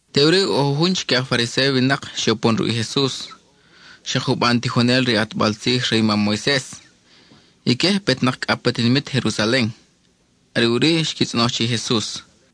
Teʼuri ʼo jujun chique i aj Fariséo winak xe upon ruʼ i Jesus, xak juban tijonel re i ʼatbal tzij re i mam Moises. Ique je petnak cʼa pa tinimit Jerusalen. Are ʼuri xqui tzʼonoj che i Jesus: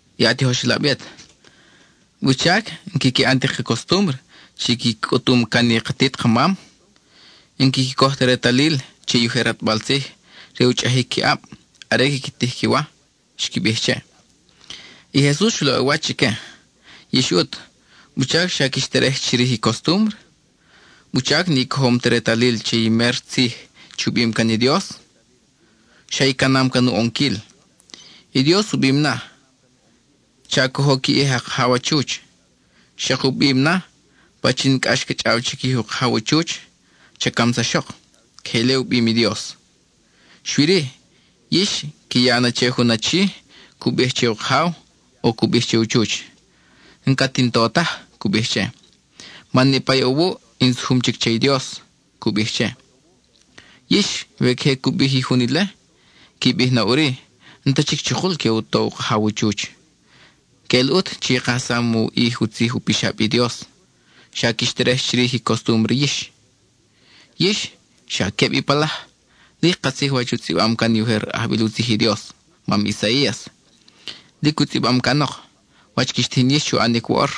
—I a tijoxelab yet, ¿wuchac n-quiqui ʼan ti ka costúmbre chi qui cʼutum can i katit kamam? N-quiqui coj ta retalil che i ujer ʼatbal tzij re u chʼajic qui ʼab are quiqui tij i qui wa —xqui bij che. I Jesus xu laʼ u wach chique: —Yix ʼut, ¿wuchac xa quix terej chirij i costúmbre? ¿Wuchac ni cojom ti retalil che i méro tzij u bim can i Dios? Xa i canam can u ʼonquil. I Dios u bim na: “Cha cojo qui ʼij a kajaw a chuch,” xak u bim na: “Pachin cʼax ca chʼaw chiquij u kajaw u chuch, cha camsaxok.” Queje ile u bim i Dios. Xui-ri, yix qui ya na che jun achi cu bij che u kajaw, cu bij che u chuch: “N-cat in to taj,” cu bij che, “man niʼpa i ʼo wuʼ in sujum chic che i Dios,” cu bij che. Yix, we queje cu bij i jun ile, qui bij na ʼuri, n-ta chic chukul que u to u kajaw u chuch. Queʼel ʼut chi i kajsam u ʼij u tzij u pixab i Dios; xa quix terej chirij i costúmbre yix. Yix ¡xa queb i palaj! Lic katzij wach u tzʼibam can i ujer ajbil u tzij i Dios, mam Isaías. Lic u tzʼibam canok wach quix tijin yix chu ʼanic woʼor.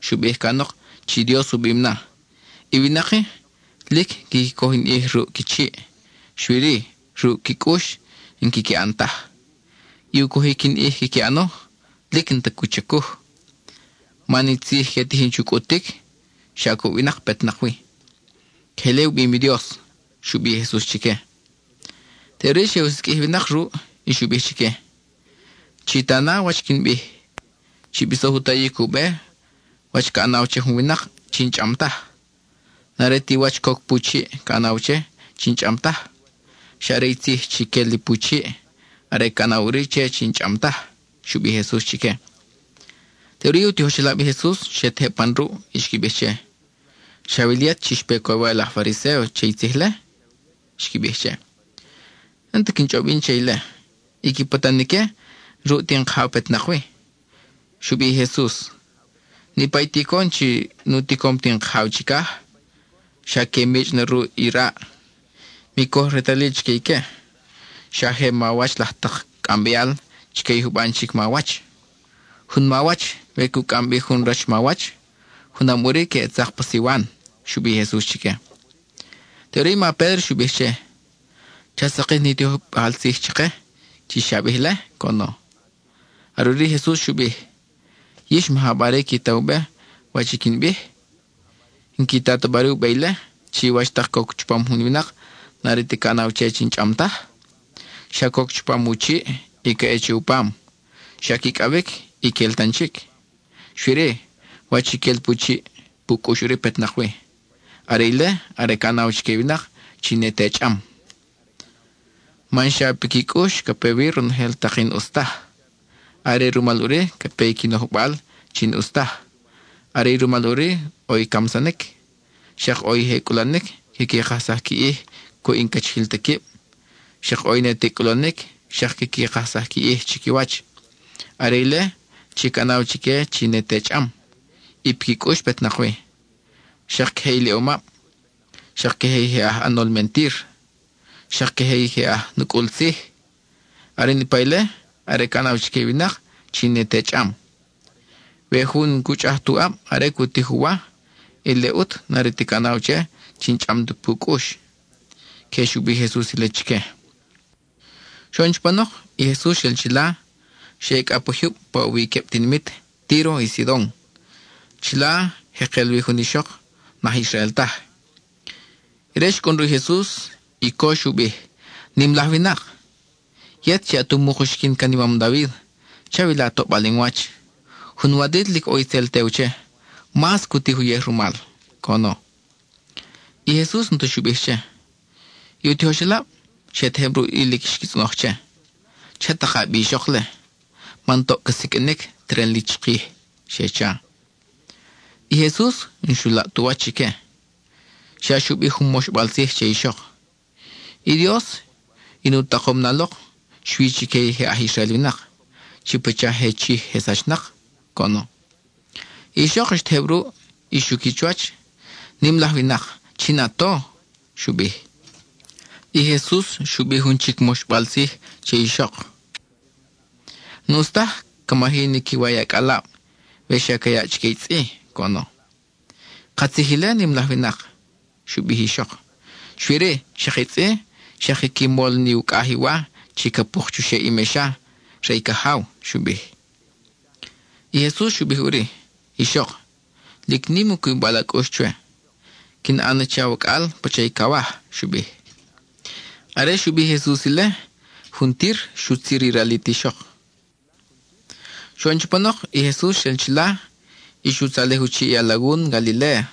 Xu bij canok chi Dios u bim na: I winak-i lic quiqui coj in ʼij ruʼ qui chiʼ, xui-ri, ruʼ qui cʼux n-quiqui ʼan taj. I u cojic in ʼij quiqui ʼano, lic n-ta cu chacuj, man i tzij que tijin chu cʼutic, xa cuʼ winak petnak wi. (Queje ile u bim i Dios —xu bij i Jesus chique.) Teʼuri xe u siqʼuij i winak ruʼ y xu bij chique: —Chi ta na wach quin bij; chi bisoj u tayic u be wach ca ʼanaw che jun winak chi n-chʼam taj. N-are ti wach coc pu chiʼ ca ʼanaw che chi n-chʼam taj, xa are i tzij chi quel li pu chiʼ; are ca ʼanaw ʼuri che chi n-chʼam taj —xu bij i Jesus chique. Teʼuri i u tijoxelab i Jesus xe tejeb pan ruʼ, y xqui bij che: —¿Xawil yet chi xpe coywal i aj Fariséo che i tzij-le? —xqui bij che. (—N-ta quin chʼob yin che ile. I qui patan ique, n-ruʼ ti in Kajaw petnak wi.) Xu bij i Jesus: —Niʼpa i ticon chi nu ticom ti in Kajaw chicaj, xa que michʼ na ruʼ i raʼ. Mi coj retalil chique ique; xa je mawach laj tak cʼambeal chique i juban chic mawach. Jun mawach, we cu cʼam bi jun rach mawach, junam ʼuri que ʼe tzak pa siwan —xu bij i Jesus chique. Teʼuri i ma Pédro xu bij che: —Cha sakij ni tijojbal tzij chake chi xa bij-le —coʼono. Are ʼuri i Jesus xu bij: —¿Yix, maja bari qui ta u be wach i quin bij? ¿N-qui ta ta bari u be ile, chi wach tak coc chupam jun winak n-are ti ca ʼanaw che chi n-chʼam taj? Xa coc chupam u chiʼ, y ca ʼe che u pam; xa quicʼawic y quel tan chic. Xui-ri, wach i quel pu chiʼ, pu cʼux ʼuri petnak wi. Are ile are ca ʼanaw chique i winak chi ne te chʼam. Man xa piqui cʼux ca pe wi ronojel tak n-ʼus taj. Are rumal ʼuri ca pe i qui nojbal chi n-ʼus taj; are rumal ʼuri ʼo i camsanic, xak ʼo i je cʼulanic quiqui kajsaj qui ʼij cuʼ i n-cachijil ta quib; xak ʼo i ne te cʼulanic xak quiqui kajsaj qui ʼij chiquiwach; are ile chi ca ʼanaw chique chi ne te chʼam, y piqui cʼux petnak wi. Xak queje iliʼomab, xak queje i je aj ʼanol mentir, xak queje i je aj nucʼul tzij. Are i niʼpa ile are ca ʼanaw chique i winak chi ne te chʼam. We jun n-cu chʼaj tu ʼab are cu tij u wa, ile ʼut n-are ti ca ʼanaw che chi n-chʼam tu pu cʼux. (Queje xu bij i Jesus ile chique.) Xoʼon chupanok, i Jesus xel chila, xa ʼe cʼa pa jyub pa ʼo wi i queb tinimit, Tíro y Sidon. Chila jekel wi jun ixok n-aj Israel taj; ire xcʼun ruʼ i Jesus y co xu bij: —¡Nim laj winak! ¡Yet chi at umuk uxiquin can i mam David! ¡Chawila toʼbal in wach! Jun walit lic ʼo itzel tew che, mas cu tij uyej rumal —coʼono. I Jesus n-ta xu bij che. I u tijoxelab xe tejeb ruʼ y lic xqui tzʼonoj che: —Cha taka bi ixok-le, man toʼ ca siqʼuinic teren li chikij —xe cha. I Jesus n-xu laʼ tu wach chique, xa xu bij jun moxbal tzij che ixok: —I Dios in u takom na lok xui chique i je aj Israel winak, chi pacha je chij je sachnak —coʼono. I ixok xtejeb ruʼ y xuqui chuwach. —Nim laj winak, ¡chin a to! —xu bij. I Jesus xu bij jun chic moxbal tzij che ixok: —N-ʼus taj ca maji ni qui wa i acʼalab, we xa ca yaʼ chique i tzʼi —coʼono. —Katzij ile, nim laj winak —xu bij i ixok—, xui-ri, xak i tzʼi xak quiqui mol ni ucʼaj i wa chi ca puk chuxeʼ i mexa re i cajaw —xu bij. I Jesus xu bij ʼuri: —Ixok, ¡lic nim u cubibal a cʼux chwe! Quin ʼan na che awacʼal pacha i cawaj —xu bij. Are xu bij i Jesus ile, juntir xutzir i ralit i ixok. Xoʼon chupanok, i Jesus xel chila y xu tzalej u chiʼ i alagun Galiléa.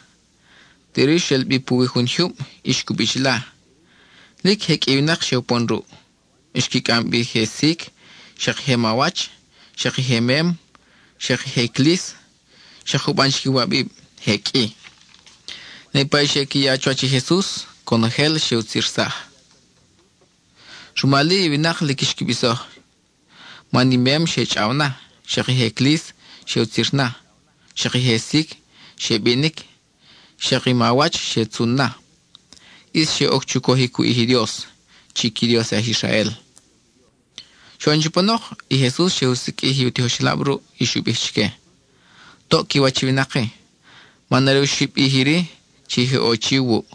Teʼuri xel bi puwi jun jyub y xcubi chila. Lic je qʼui i winak xe upon ruʼ. Xqui cʼam bi i je sic, xak i je mawach, xak i je mem, xak i je clis, xak juban chic iwabib, je qʼui. Niʼpa i xe qui ya chuwach i Jesus, conojel xe rutzirsaj. Rumal-i, i winak lic xqui bisoj, man i mem xe chʼaw na; xak i je clis, xe utzir na; xak i je sic, xe binic; xak i mawach, xe tzun na. ʼIs xe oc chu cojic u ʼij i Dios, chi qui Dios i aj Israel. Xoʼon chupanok, i Jesus xe u siqʼuij i u tijoxelab ruʼ, y xu bij chique: —Toʼ qui wach i winak-i, man are oxib ʼij iri chi je ʼo chi wuʼ;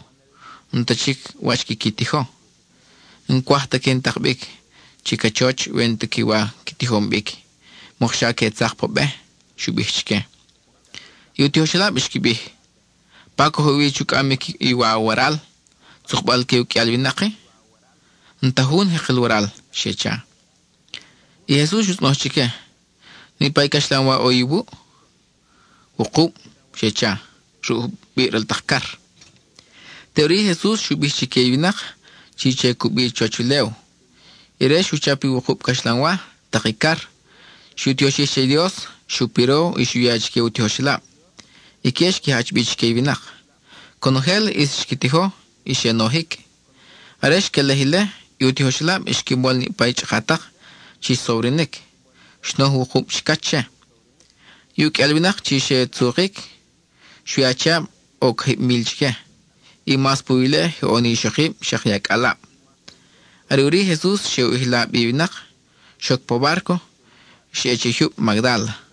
n-ta chic wach quiqui tijo. N-cwaj ta que in tak bi che cachoch we n-ti wa qui tijom bic, mokxa que tzak pa be —xu bij chique. I u tijoxelab xqui bij: —¿Pa coj ʼe wi chu cʼamic i wa waral, tzukbal-que uqʼuial winak-i? N-ta jun jekel waral —xe cha. I Jesus xu tzʼonoj chique: ¿Niʼpa i caxlanwa ʼo iwuʼ? —Wukub —xe cha—, ruʼ jubiʼ ral tak car. Teʼuri i Jesus xu bij chique i winak chi che cubi chuwach ulew. Ire xu chap i wukub caxlanwa, tak i car. Xu tioxij che i Dios, xu piro y xu ya chique u tijoxelab. Ique xqui jach bi chique i winak. Conojel ʼis xqui tijo y xe nojic. Are xquelej ile, i u tijoxelab xqui mol niʼpa i chʼakatak chi xsobrinic; xnoj wukub chicach che. I uqʼuial winak chi xe tzukic, xui achiab ʼo cajib mil chique, y mas puwi ile je ʼo ni ixokib, xak i acʼalab. Are ʼuri i Jesus xe u ʼijla bi i winak, xoc pa bárco, y xa ʼe che i jyub Magdála.